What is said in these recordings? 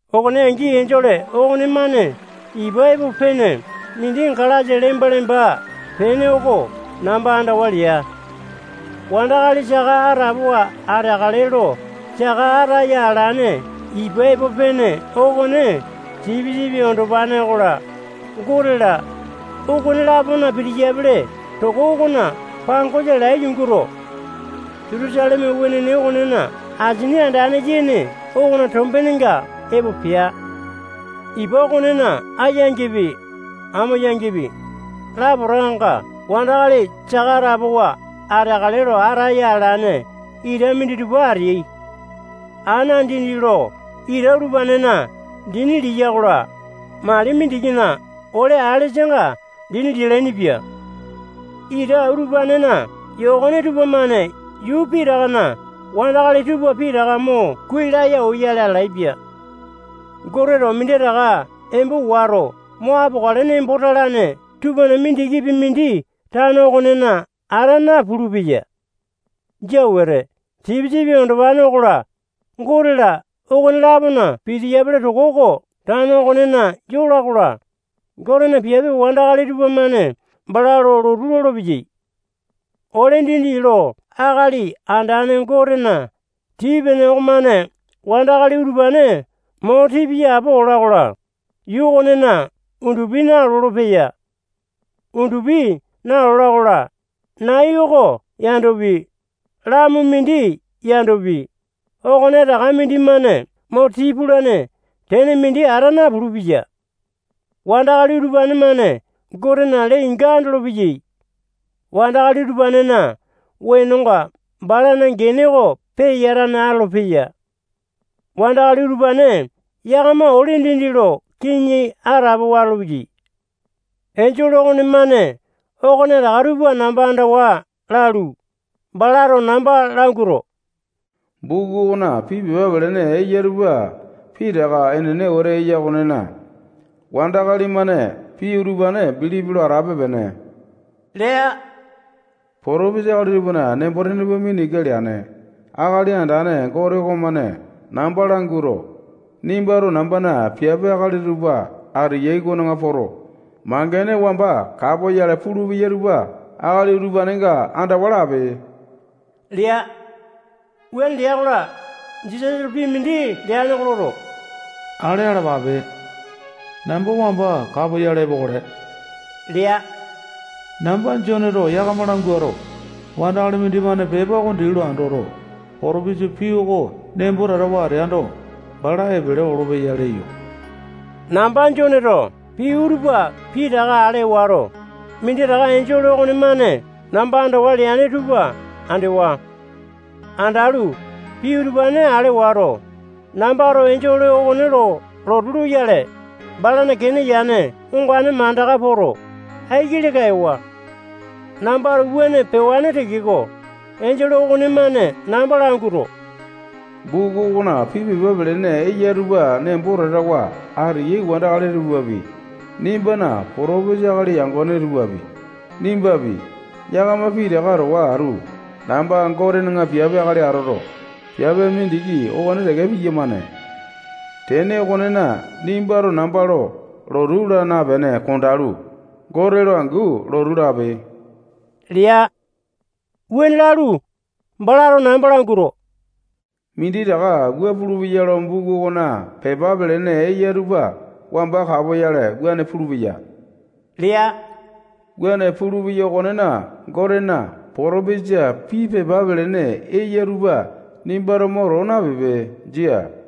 Okone angi enjole okonemane ipa epo pene mindi galasa lemba-lemba pene oko namba andawa lea. Wandakali saka atapowa ateakale lo saka ataya alane ipa epo pene okone Sipisipi Andopane okola, Gote-la, okone-lapona pitiyapele toko okona pangosa lai yunguto, Jutusaleme wenene okonena asini andane yene okona tombenenga epo pea. Ipa okonena ayangipi, amo yangipi, lapotakanga wandakali saka atapowa ateakale lo ataya alane ita minditupa ateai. Ana dindi lo ita utupanena dini liya-kola, mali mindikina ole alesanga dini lialaini-pia. Ita utupanena yokone tupamane yuu pitakana wandakali tupa pitaka mo kuai laya oyale atalaepia. Goteto minditaka embo wato mo apokale nembo talane tupana mindikipi mindi tano okonena ata napulu-peya. Jia wete. Sipisipi Andopane okola, Gote-la, okone-lapona pitiyapele toko oko tano okonena yola-kola, Gotena piape wandakali tupamane bala lo lotu lolopeyai. Ole dindi lo Akali Andane Gotena tii-pene okomane wandakali utupane mo tii piya apo ola-kola, yuu okonena undupi nalolo-peya. Undupi nalola-kola, nai oko yandopi, lamu mindi yandopi, okonetaka mindimane mo tii pulane tene mindi ata napulu-peya. Wandakali utupane-mane Gotena lee-inga andolopeyai. Wandakali utupanena wenonga balana gene oko peyatane atolopeya. Wandakali utupane yakama ole dindi lo kiŋi atapowa atolopeyai. Enjole okonemane okonetaka tupa namba andawa lalu, balato namba languato, buku okona pii pepa pelene eya tupa pitaka enene wete eya okonena, wandakali-mane pii utupane bilipi lo atape-pene lea. Potopesa akali tupana nembo-tene tupa mina ika leane Akali Andane Gote okomane namba languato, nimbato nambana piape akali tupa ateyai okona poto, mangene wamba kapoyale pulupeya tupa akali utupanenga andawa lape lea. Wuane lea-kola, Jisasato pii mindi leane oko loto, ale alapape. Namba wamba kapoyale epokale lea. Namba Joneto yakama languato, wandakali mindimane pepa oko dii lo andoto, potopesa pii oko nembo tatawa ateando, bala epele olopeya leyo. Namba Joneto pii utupa pitaka ale wato, minditaka enjole okonemane namba andawa leane tupa andewa. Andalu, pii utupane ale wato, nambato enjole okone lo lotu loyale, balana kene yane ongane mandaka poto, aiki leka ewa. Nambato wuane pewane tekeko, enjole okonemane namba languato, buku okona pii pepa pelene eya tupa nembo tatawa ateyai wandakali tupapi, nimbana potopesa akali yangone tupapi, nimbapi, yakama pitaka towa atu namba Gotena piape akali atoto, piape mindiki okone teke piyamane. Tene okonena, nimbato namba lo lotu laa napene kondalu, Gote lo angu lotu lape lea. Wuane lalu, balato namba languato, minditaka wua pulupeya lo buku okona pepa pelene eya tupa wamba kapoyale wuane pulupeya lea. Wuane pulupeya okonena, Gotena potopesa pii pepa pelene eya utupa nimbato mo too napipe. Jia.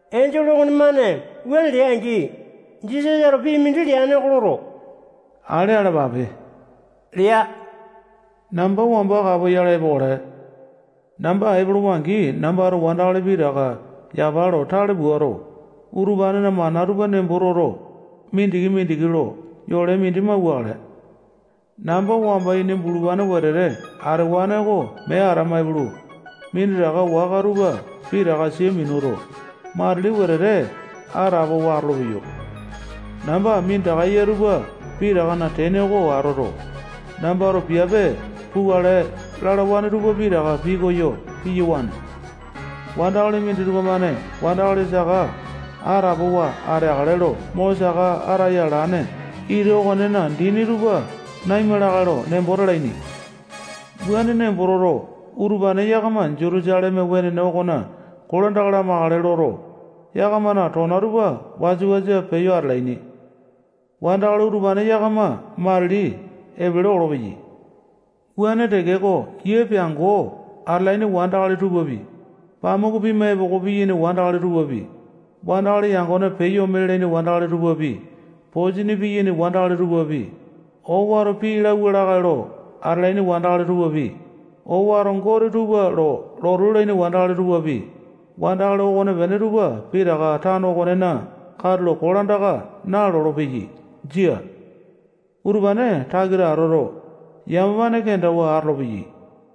Enjole okonemane wuane lea-angi, Jisasato pii mindi leane oko loto, ale alapape lea. Namba wamba kapoyale epokale. Namba epolowa-angi, nambato wandakali pitaka yapa lo tale puato, utupanena mana tupa nembo toto, mindiki-mindiki lo yole mindi mauwakale. Namba wamba ini bulupane wetete atewane oko mee atama ipulu, minditaka waka tupa pitaka sia minuto, matili wetete atapowa atolopeyo. Namba minditaka eya tupa pitakana tene oko atoto, nambato piape pukale lalawane tupa pitaka pikoyo piyawane. Wandakali minditupa-mane wandakali saka atapowa ateakale lo mo saka ataya alane ita okonena dini tupa naima lakae lo nembo talaini. Wuane nembo toto, utupane yakama Jutusaleme wenene okona kolandaka lamakale loto, yakamana tona tupa wasa-wasa peyo atalaini. Wandakali utupane yakama matili epele olopeyai. Wuane tekeko, yia peango atalaini wandakali tupapi, pamuku pima epoko piyaini wandakali tupapi, wandakali yangone peyo ome lalaini wandakali tupapi, posini piyaini wandakali tupapi, owato pii lauwa lakae lo atalaini wandakali tupapi, owato gote tupa lo lotu lalaini wandakali tupapi, wandakali okonepene tupa pitaka tano okonena katulo kolandaka nalolo-peyai. Jia. Utupane takita atoto, yamapane kendawa atolopeyai.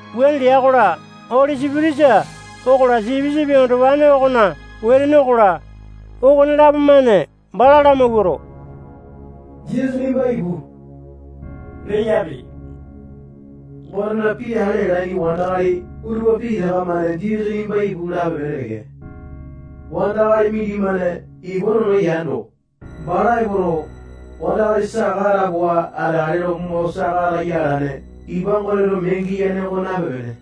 Wuane lea-kola, Oli Sipitisa okola, Sipisipi Andopane okona wetene okola, okonelapo-mane bala lamawuato, Jisasa nimba ipu leyapi. Gotena pii ale alaini wandakali utupa pitaka-mane Jisasa nimba ipu lape-pene teke. Wandakali mindimane ipa nono yando, bala epoto, wandakali saka atapowa ateakale lo mo saka ataya alane ipa Goteto mee giyane oko nape-pene.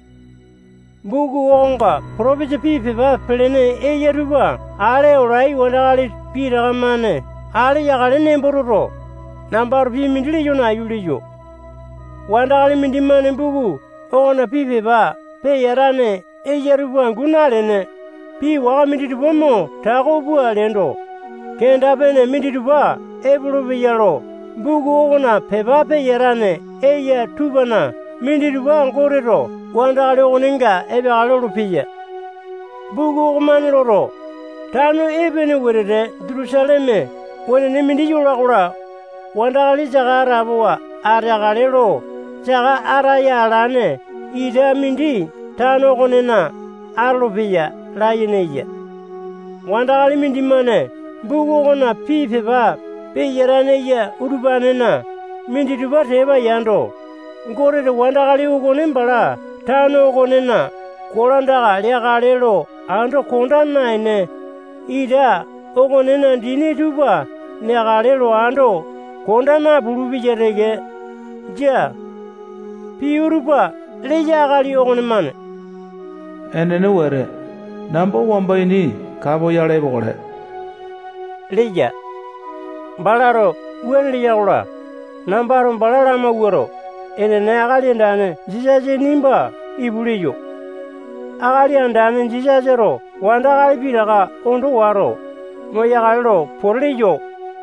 Buku okonga potopesa pii pepa pelene eya tupa ale olai wandakali pitaka-mane ale yakale nembo toto, nambato pii mindi leyo nayu leyo. Wandakali mindimane buku okona pii pepa peyatane eya tupa angu nalene, pii waka minditupa mo tako pua leando, kenda-pene minditupa epolopeya lo buku okona pepa peyatane eya tupana minditupa Goteto wandakali okonenga epeakale lolopeya. Buku okomane loto, tano epene wetete Jutusaleme wenene mindi yola-kola, wandakali saka atapowa ateakale lo saka ataya alane ita mindi tano okonena atolopeya layene eya. Wandakali mindimane buku okona pii pepa peyatane eya utupanena minditupa tepa yando, Goteto wandakali okone bala tano okonena kolandaka leakale lo ando konda naene, ita okonena dini tupa neakale lo ando konda napulu-peya teke. Jia. Pii utupa leya akali okonemane enene wete, namba wamba ini kapoyale epokale leya. Balato wuane leya-kola, nambato bala lamawuato, enene, Akali Andane Jisasa nimba ipu leyo. Akali Andane Jisasato wandakali pitaka ondo wato, moyakale lo pote leyo.